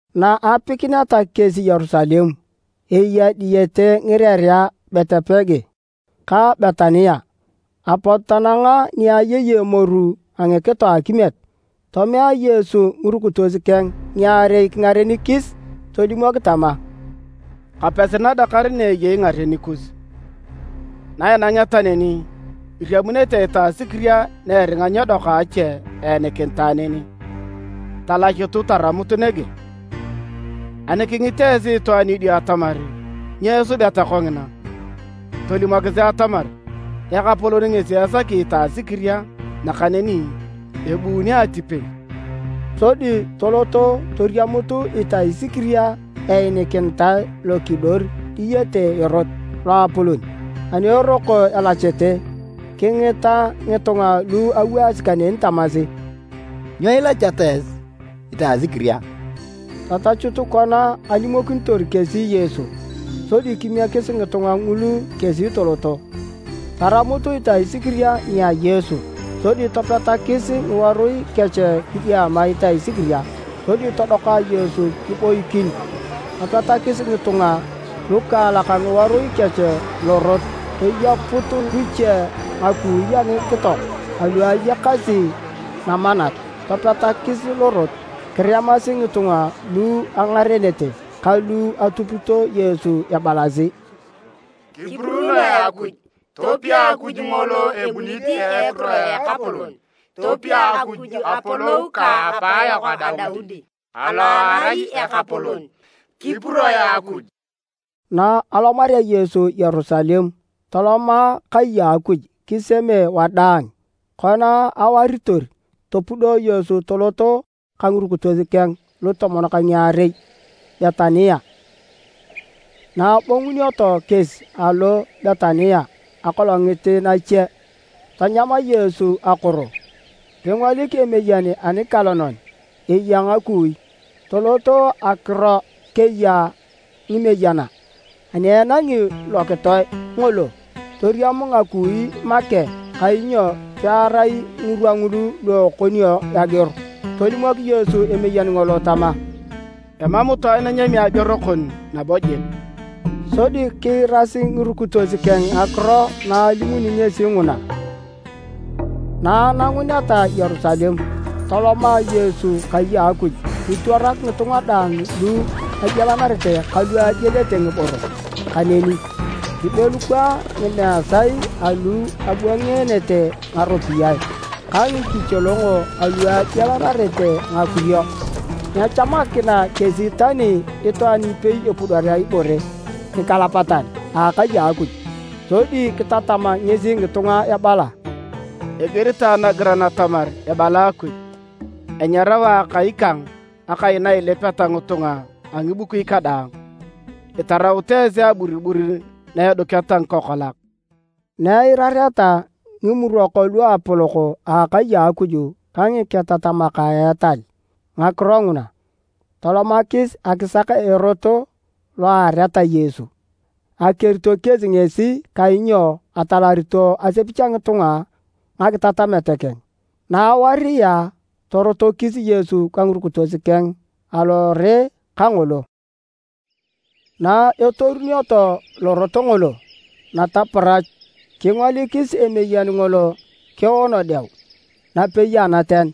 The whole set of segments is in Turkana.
Na apikineta kesi Yerusalem, eya diyete ngirerea a Betipage ka Betania, apot tananga ni ayei emoru a ngikito a akimiet. Tomea Yesu ngirukitos keng ngiarei kingarenikis. Tolimok tama, “Kapesi nadakar na eyei ngaren kus, na inangeta neni, iriamunete itasikiria ni eringa nyedoka a ache eenikinitae neni. Talachutu taramut nege. Ani kingit esi itwaan idio atamar nyo isubeta kongina, tolimokisi atamar Ekapolon ngesi esaki itasikiria nakaneni ebuuni atipei.” Sodi toloto toriamut itasikiria einikinitae lokidor diyete erot loapolon. Ani eroko elachete, kingita ngitunga lu awaasi kaneni tamasi, “Nyo ilacheta esi itasikiria?” Tatachut kona alimokinitor kesi Yesu, sodi kimiekis ngitunga ngulu kesi toloto. Taramut itasikiria nia Yesu, sodi topetakis ngiworui kech kidiama itasikiria sodi todoka Yesu kiboikin. Topetakis ngitunga lukaalak ngiworui kech lorot toyeput luche ngakui a ngikito alu ayakasi namanat topetakis lorot. Kiremasi ngitunga lu engarenete ka lu atupito Yesu ebalasi, “Kipuruunoe Akuj! Topia Akuj ngolo ebunit a ekiro a Ekapolon! Topia Akuj apolou ka apayok Daudi alo erai ekapolon! Kipuroe Akuj!” Na alomarea Yesu Yerusalem toloma kai a Akuj kiseme wadaang. Kona awaritor, topudo Yesu toloto ka ngirukitos keng lutomon ka ngiarei Betania. Na abongunioto kesi alo Betania akolongit nache, tanyam Yesu akoro. Kingolik emeyen anialonan eya ngakui, tolot akiro keya ngameyena. Ani enangi lokitoe ngolo, toriam ngakui make kainyo pearai ngirwa ngulu lu ekonio ageor. Tolimok Yesu emeyen ngolo tama, “Emam itwaan enyami ageor kon nabo jik!” Sodi kiirasi ngirukitos keng ngakiro na alimuni ngesi nguna. Na ananguneta Yerusalem toloma Yesu kai a Akuj kitwarak ngitunga daang lu agialanarete ka lu agielete ngiboro kaneni. Kibelukwaa ngimeesae alu abwangeenete ngaropiyae ka ngikicholongo alu agialanarete ngakurio. Nyechamakina kesi tani itwaan ipei epudorea ibore nikalapatan a akai a Akuj. Sodi kitatam ngesi ngitunga ebala, “Igiritae nagiran atamar ebala Akuj, ‘Enyarao Akai kang akai na ilipeta ngitunga a ngibukui kadaang.’ Itaraut esi aburibur na eduketa ngikokolak!” Na eirareta Ngimurok Luapolok a akai a Akuj ka ngiketatamak a etal ngakiro nguna, tolomakis akisak erot lo eareta Yesu. Akerito kesi ngesi kainyo atalarito asepich a ngitunga ngakitatamet keng. Na awaria, torotokis Yesu ka ngirukitos keng alore kangolo. Na etorunioto lorot ngolo nataparach, kingolikis emeyen ngolo keono deu napei anaten.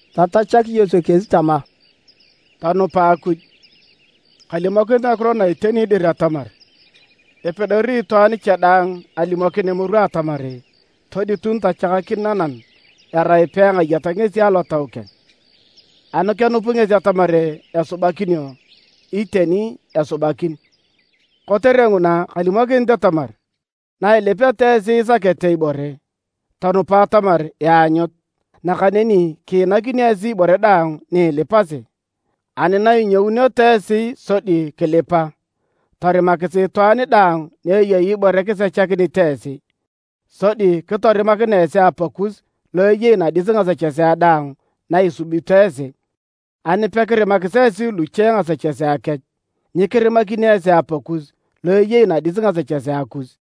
Tatachak Yesu kesi tama, “Tonupa Akuj. Kalimokinit ngakiro na iteni dir atamar, epedori itwaan cha daang alimokin emoru atamar toditun tachakakin nanam erai pekengayat ngesi alotau keng. Ani kenup ngesi atamar esubakinio, iteni esubakin. Kotere nguna kalimokinit atamar, na ilipeta esi isakete ibore, tonupa atamar ianyut, nakaneni kiinakinio esi ibore daang ni ilipasi. Ani na inyouneto esi sodi kilipa, torimakisi itwaan daang ni eyei ibore kisechakinit esi, sodi kitorimakinea esi Apakus lo eyei nadis ngasechesea daang na isubito esi. [ Ani pekirimakis esi luche ngasechesea kech, nyikirimakini esi Apakus lo eyei nadis ngasechesea kus.”]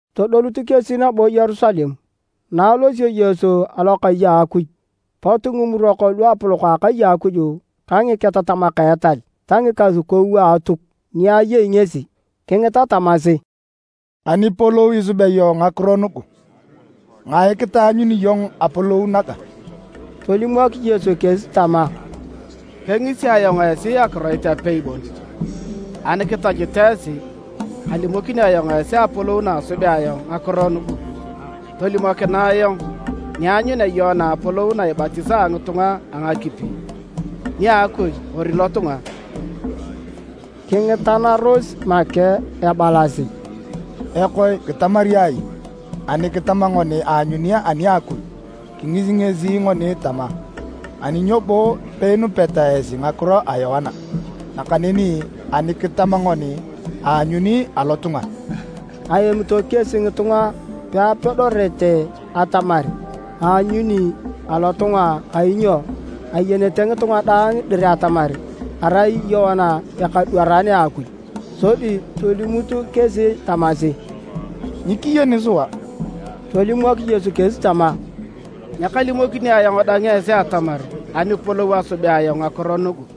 Todolut kesi nabo Yerusalem. Na alosio Yesu alokai a Akuj, pot Ngimurok Luapolok a akai a Akuj ka ngiketatamak a etal ta ngikasukou a Atuk ni ayei ngesi, kingita tamasi, “Anipolou isubea iyong ngakiro nugu? Ngae kitaanyuni iyong apolou naga?” Tolimok Yesu kesi tama, “Kengisi ayong esi akiroit apei bon, ani kitachut esi, kalimokini ayong esi apolou na asubea ayong ngakiro nugu. Tolimokinae ayong nianyunea Yoana apolou na ibatisaa ngitunga a ngakipi, nia Akuj kori lotunga?” Kingitanaros make ebalasi: “Ekoe, kitamari ai? Ani kitama ngoni aanyuni ani a Akuj, kingisi ngesi ngoni tama, ‘Ani nyo bo peinupeta esi ngakiro a Yoana?’ Nakaneni ani kitama ngoni, ‘Aanyuni alotunga...’” (Aemito kesi ngitunga peapedorete atamar aanyuni alotunga, kainyo ayenete ngitunga daang dir atamar arai Yoana ekadwaran a Akuj.) Sodi tolimut kesi tamasi, “Nyikiyeni sua.” Tolimok Yesu kesi tama, “Nyakalimokini ayong dang esi atamar anipolou asubea ayong ngakiro nugu.”